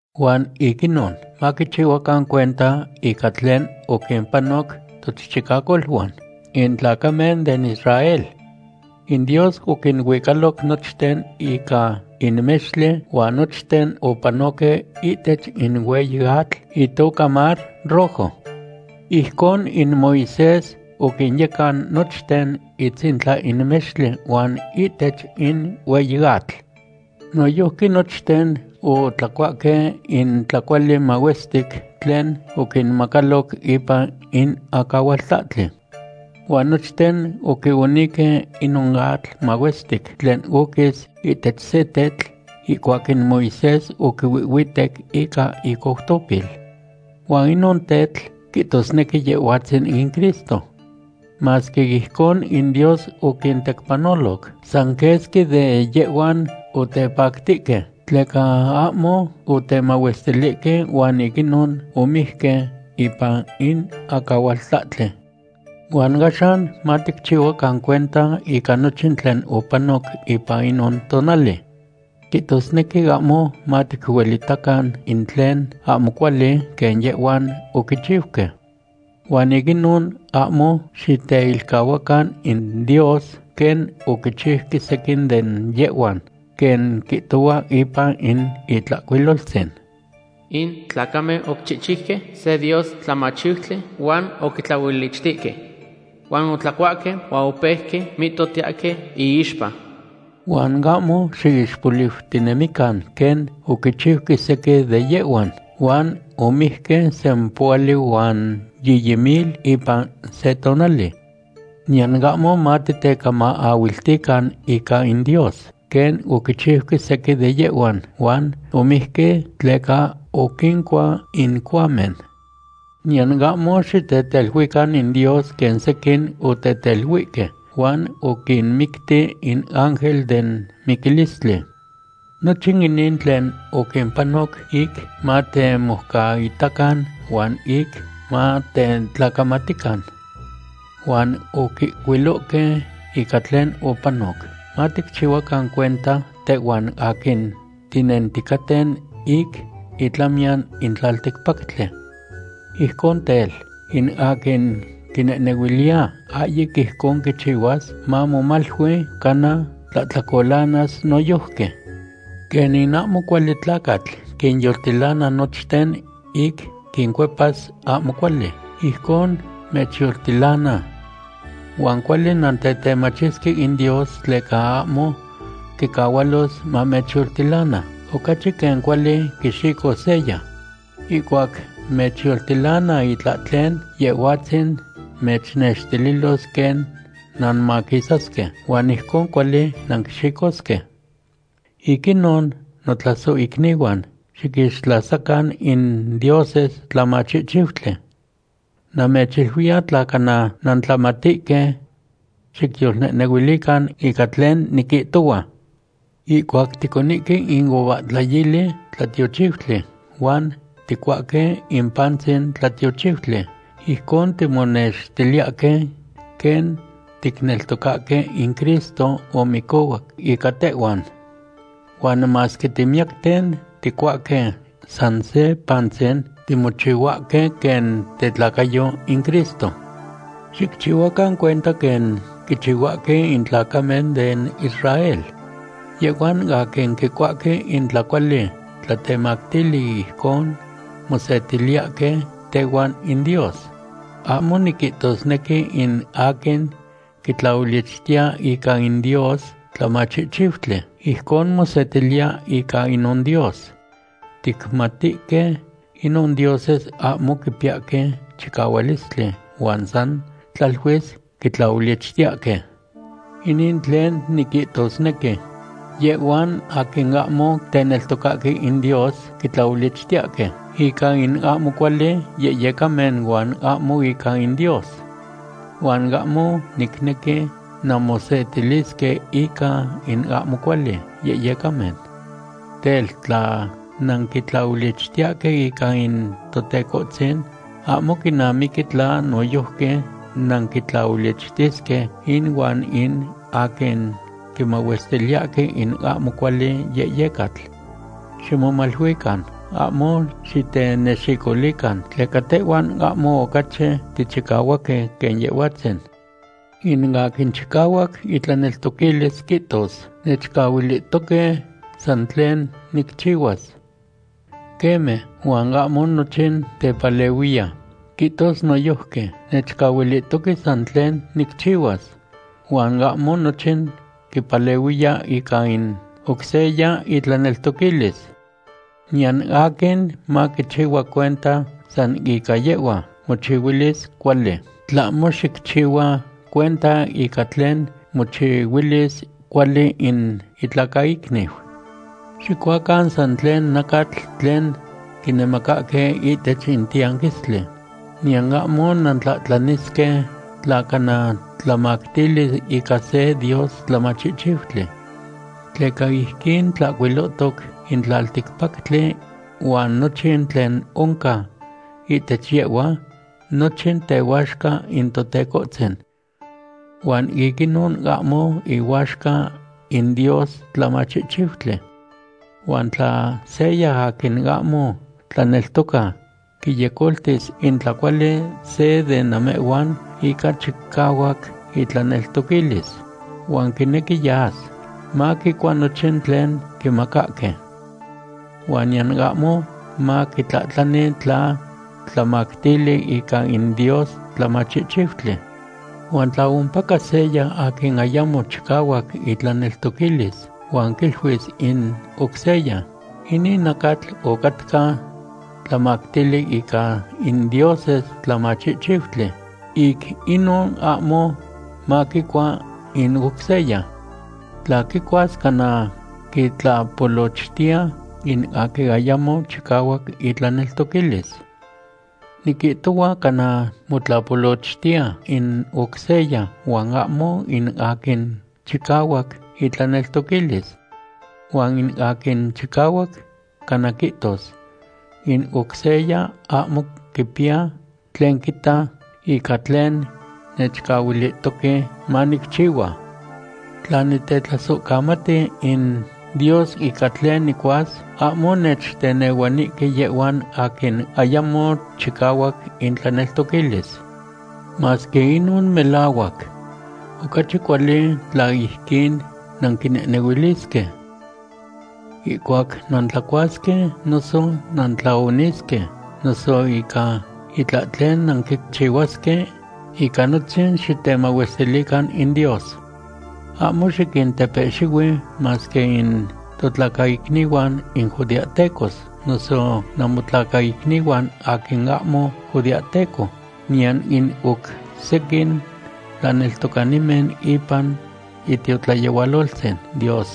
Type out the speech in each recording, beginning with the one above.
Huan ic inon, maquichihuacan cuenta ica tlen oquimpanoc tochichicacoluan, in tlacamen den Israel. In Dios oquinuicaloc nochten ica in mextli huan nochten opanohque ihtech in hueyi atl itoca Mar Rojo. Ijcon in Moisés oquinyecan nochten itzintla in mextli huan ihtech in hueyi atl. Noyojqui nochten otlacuahque in tlacuali mahuestic tlen oquinmacaloc ipan in acahualtlahtli. Huan nochten oquionihque inon atl mahuestic tlen oquis ihtech se tetl ihcuac in Moisés oquihuitec ica icoutopil. Huan inon tetl quihtosnequi Yehhuatzin in Cristo. Masque ijcon in Dios oquintecpanoloc, san quesqui de yehhuan otepactihque, tleca ahmo otemahuestilihque huan ic inon omijque ipan in acahualtlahtli. Huan axan maticchihuacan cuenta ica nochin tlen opanoc ipan inon tonali. Quihtosnequi ahmo maticuelitacan in tlen ahmo cuali quen yehhuan oquichiuque. Huan ic inon, ahmo xiteilcahuacan in Dios, quen oquichiuque sequin de yehhuan, quen quihtohua ipan in Itlahcuiloltzin: “In tlacamen oquichihchiuque se dios tlamachihchiutli huan oquitlaolichtihque. Huan otlacuahque huan opeuque mihtohtiyahque iixpa.” Huan ahmo xiixpoliutinemican quen oquichiuque sequin de yehhuan, huan omijque sempohuali huan yiyi mil ipan se tonali. Niyan ahmo matitecamaahuiltican ica in Dios, quen oquichiuque sequin de yehhuan huan omijque tleca oquincua in cohuamen. Niyan ahmo xiteteluican in Dios quen sequin oteteluihque, huan oquinmicti in ángel den miquilistli. Nochin inin tlen oquimpanoc ic matemoucaitacan huan ic matetlacamatican. Huan oquihcuilohque ica tlen opanoc, maticchihuacan cuenta tehhuan aquin tinenticaten ic itlamiyan in tlalticpactli. Ijcon tel, in aquin quinehnehuiliya ahyic ijcon quichihuas, mamomalui cana tlahtlacolanas noyojqui. Quen in ahmo cuali tlacatl quinyoltilana nochten ic quincuepas ahmo cuali, ijcon mechyoltilana. Huan cuali nantetemachisque in Dios tleca ahmo quicahualos mamechyoltilana ocachi quen cuali quixicos seya. Ihcuac mechyoltilana itlahtlen, Yehhuatzin mechnextililos quen nanmaquisasque huan ijcon cuali nanquixicosque. Ic inon, notlasohicnihuan, xiquixtlasacan in dioses tlamachihchiutli. Namechiluiya tla cana nantlamatihque. Xicyolnehnehuilican ica tlen niquihtohua. Ihcuac ticonihque in uvahtlayili tlatiochiutli huan ticuahque in pantzin tlatiochiutli, ijcon timonextiliyahque quen ticneltocahque in Cristo omicohuac ica tehhuan. Huan masque timiyacten, ticuahque san se pantzin, timochihuahque quen tetlacayo in Cristo. Xicchihuacan cuenta quen quichihuahque in tlacamen den Israel. Yehhuan aquin quicuahque in tlacuali tlatemactili, ijcon mosetiliyahque tehuan in Dios. Ahmo niquihtosnequi in aquin quitlaolichtiya ica in dios tlamachihchiutli, ijcon mosetiliya ica inon dios. Ticmatihque inon dioses ahmo quipiyahque chicahualistli huan san tlaluis quitlaolichtiyahque. Inin tlen niquihtosnequi. Yehhuan aquin ahmo teneltocahque in Dios quitlaolichtiyahque ica in ahmo cuali yehyecamen huan ahmo ica in Dios. Huan ahmo nicnequi nanmosetilisque ica in ahmo cuali yehyecamen. Tel, tla nanquitlaolichtiyahque ica in Totecohtzin, ahmo quinamiqui tla noyojqui nanquitlaolichtisque inuan in aquin quimahuestiliyahque in ahmo cuali yehyecatl. Ximomaluican ahmo xitenexicolican, tleca tehhuan ahmo ocachi tichicahuaque quen Yehhuatzin. In aquin chicahuac itlaneltoquilis quihtos: “Nechcahuilihtoque san tlen nicchihuas.” Queme, huan ahmo nochin tepalehuiya. Quihtos noyojqui: “Nechcahuilihtoque san tlen nicchihuas.” Huan ahmo nochin quipalehuiya ica in oc seya itlaneltoquilis. Niyan aquin maquichihua cuenta san ica yehhua mochihuilis cuali, tlahmo xicchihua cuenta ica tlen mochihuilis cuali in itlacaicniu. Xicuacan san tlen nacatl tlen quinemacahque ihtech in tiyanquistli, niyan ahmo nantlahtlanisque tla cana tlamactili ica se dios tlamachihchiutli. Tleca ijquin tlahcuilotoc: “In tlalticpactli huan nochin tlen oncan ihtech yehhua, nochin tehuaxca in Totecohtzin.” Huan ic inon ahmo ihuaxca in dios tlamachihchiutli. Huan tla seya aquin ahmo tlaneltoca quiyecoltis in tlacuali se de namehhuan ica chicahuac itlaneltoquilis, huan quinequi yas, maquicua nochin tlen quimacahque. Huan niyan ahmo maquitlahtlani tla tlamactili ica in dios tlamachihchiutli. Huan tla ompaca seya aquin ayamo chicahuac itlaneltoquilis huan quiluis in oc seya: “Inin nacatl ocatca tlamactili ica in dioses tlamachihchiutli”, ic inon ahmo maquicua in oc seya. Tla quicuas cana quitlapolochtiya in aquin ayamo chicahuac itlaneltoquilis. Niquihtohua cana motlapolochtiya in oc seya huan ahmo in aquin chicahuac itlaneltoquilis. Huan in aquin chicahuac cana quihtos: “In oc seya ahmo quipiya tlen quita ica tlen nechcahuilihtoque manicchihua. Tla nitetlasohcamati in Dios ica tlen nicuas, ahmo nechtenehuanihque yehhuan aquin ayamo chicahuac intlaneltoquilis.” Masque inon melahuac, ocachi cuali tla ijquin nanquinehnehuilisque. Ihcuac nantlacuasque noso nantlaonisque, noso ica itlahtlen nanquichihuasque, ica nochin xitemahuestilican in Dios. Ahmo xiquintepehxihui masque in totlacaicnihuan in judeahtecos, noso namotlacaicnihuan in aquin ahmo judeahteco, niyan in oc sequin tlaneltocanimen ipan itiotlayehualoltzin Dios.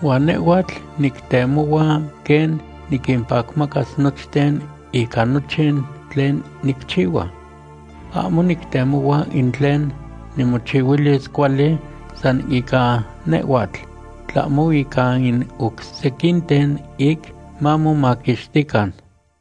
Huan nehhuatl nictemohua quen niquimpacmacas nochten ica nochin tlen nicchihua. Ahmo nictemohua in tlen nimochihuilis cuali san ica nehhuatl, tlahmo ica in oc sequinten, ic mamomaquixtican.